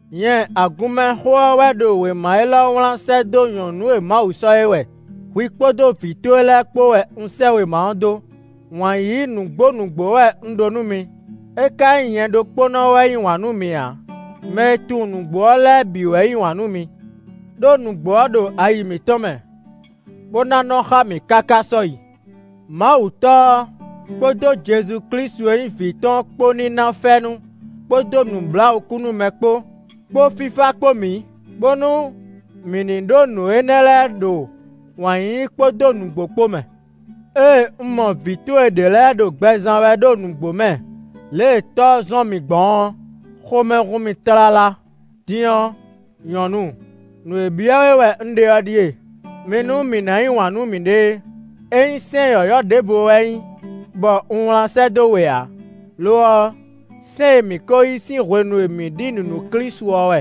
Nyɛ Agunmɛxó ɔ́ wɛ ɖo wěma élɔ́ wlán sɛ́ dó Nyɔ̌nu e Mawu sɔ́ é wɛ; hwi kpódó vǐ towe lɛ́ɛ kpó wɛ un sɛ́ wěma ɔ́ dó. Wǎn yíyí nǔgbó nǔgbó wɛ un ɖó nú mi. É ka nyí nyɛ ɖokpónɔ wɛ yí wǎn nú mi ǎ; mɛ e tunwun nǔgbó ɔ́ lɛ́ɛ bǐ wɛ yí wǎn nú mi. Đó nǔgbó ɔ́ ɖo ayi mǐtɔn mɛ, bó ná nɔ xá mǐ káká sɔ́yi. Mawu Tɔ́ ɔ́ kpódó Jezu Klísu e nyí vǐ tɔn ɔ́ kpó ní ná fɛ́nú kpódó nǔbláwǔkúnúmɛ kpó, kpó fífá kpó mǐ, bónú mǐ ní ɖó nǔ énɛ́ lɛ́ɛ ɖo wǎn yíyí kpódó nǔgbó kpó mɛ. Ée un mɔ vǐ towe ɖě lɛ́ɛ ɖo gbɛ zán wɛ ɖo nǔgbó mɛ lě e Tɔ́ ɔ́ zɔ́n mǐ gbɔn ɔ́, xomɛ hun mì tlala; din ɔ́, nyɔ̌nu, nǔ e byɔ́ we wɛ un ɖe ɔ́ ɖíe: mi nú mǐ ná yí wǎn nú mǐɖée; é nyí sɛ́n yɔ̌yɔ́ ɖěvo wɛ nyí bɔ un wlán sɛ́ dó we ǎ; lo ɔ́, sɛ́n e mǐ ko yí sín hwenu e mǐ ɖi nǔ nú Klísu ɔ́ wɛ.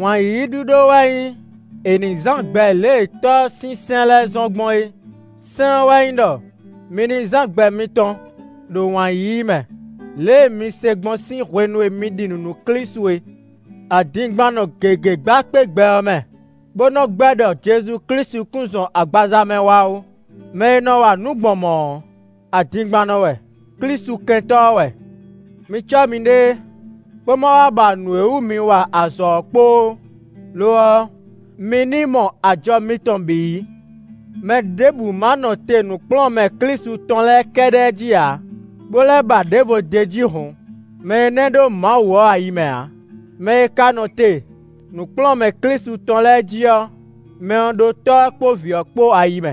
Wǎn yíyí ɖíɖó wɛ nyí è nǐ zán gbɛ lě e Tɔ́ ɔ́ sín sɛ́n lɛ́ɛ zɔ́n gbɔn é; sɛ́n ɔ́ wɛ nyí ɖɔ: mi ní zán gbɛ mitɔn ɖo wǎn yíyí mɛ, lě e mi se gbɔn sín hwenu e mi ɖi nǔ nú Klísu é. Adingbannɔ gěgé gba kpé gbɛ ɔ́ mɛ, bó nɔ gbɛ́ ɖɔ Jezu Klísu kún zɔn agbaza mɛ wá ó. Mɛ e nɔ wa nǔ gbɔn mɔ̌ ɔ́, adingbannɔ wɛ; Klísu Kɛntɔ́ ɔ́ wɛ. Mi cɔ́ miɖée, bó ma wá ba nǔ e wú mi wa azɔ̌ ɔ́ kpo ó; lo ɔ́, mi ní mɔ ajɔ mitɔn bǐ yí. Mɛɖěbǔ ma nɔ te nǔkplɔ́nmɛ Klísu tɔn lɛ́ɛ kɛ́ɖɛ́ jí ǎ, bó lɛ́ ba ɖěvo d'é jí hǔn, mɛ énɛ́ ɖó Mawu ɔ́ ayi mɛ ǎ. Mɛ e ka nɔ te nǔkplɔ́nmɛ Klísu tɔn lɛ́ɛ jí ɔ́, mɛ ɔ́ ɖó Tɔ́ ɔ́ kpó Vǐ ɔ́ kpó ayi mɛ.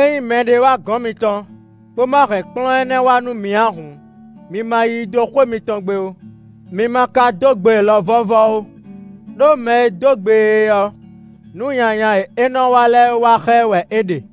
Ényí mɛɖé wá gɔ̌n mitɔn, bó ma hɛn kplɔ́n énɛ́ wá nú mi ǎ hǔn, mi ma yí i dó xwé mitɔn gbe ó; mi ma ka dó gbe e lɔ vɔ́vɔ́ ó. Đó mɛ e dó gbe e ɔ́, nǔ nyanya e é nɔ wa lɛ́ɛ wa xá ɛ wɛ é ɖe.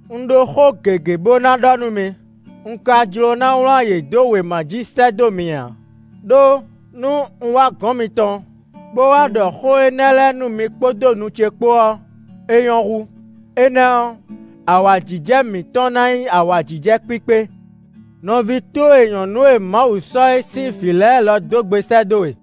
Un ɖó xó gěgé bó ná ɖɔ nú mi, un ka jló ná wlán yě dó wěma jí sɛ́ dó mi ǎ; ɖó nú un wá gɔ̌n mitɔn, bó wá ɖɔ xó énɛ́ lɛ́ɛ nú mi kpódó nu ce kpo ɔ́, é nyɔ́ hú; énɛ́ ɔ́, awǎjijɛ mǐtɔn ná nyí awǎjijɛ kpíkpé. Nɔví towe nyɔ̌nu e Mawu sɔ́ é sín vǐ lɛ́ɛ lɔ dó gbe sɛ́ dó we.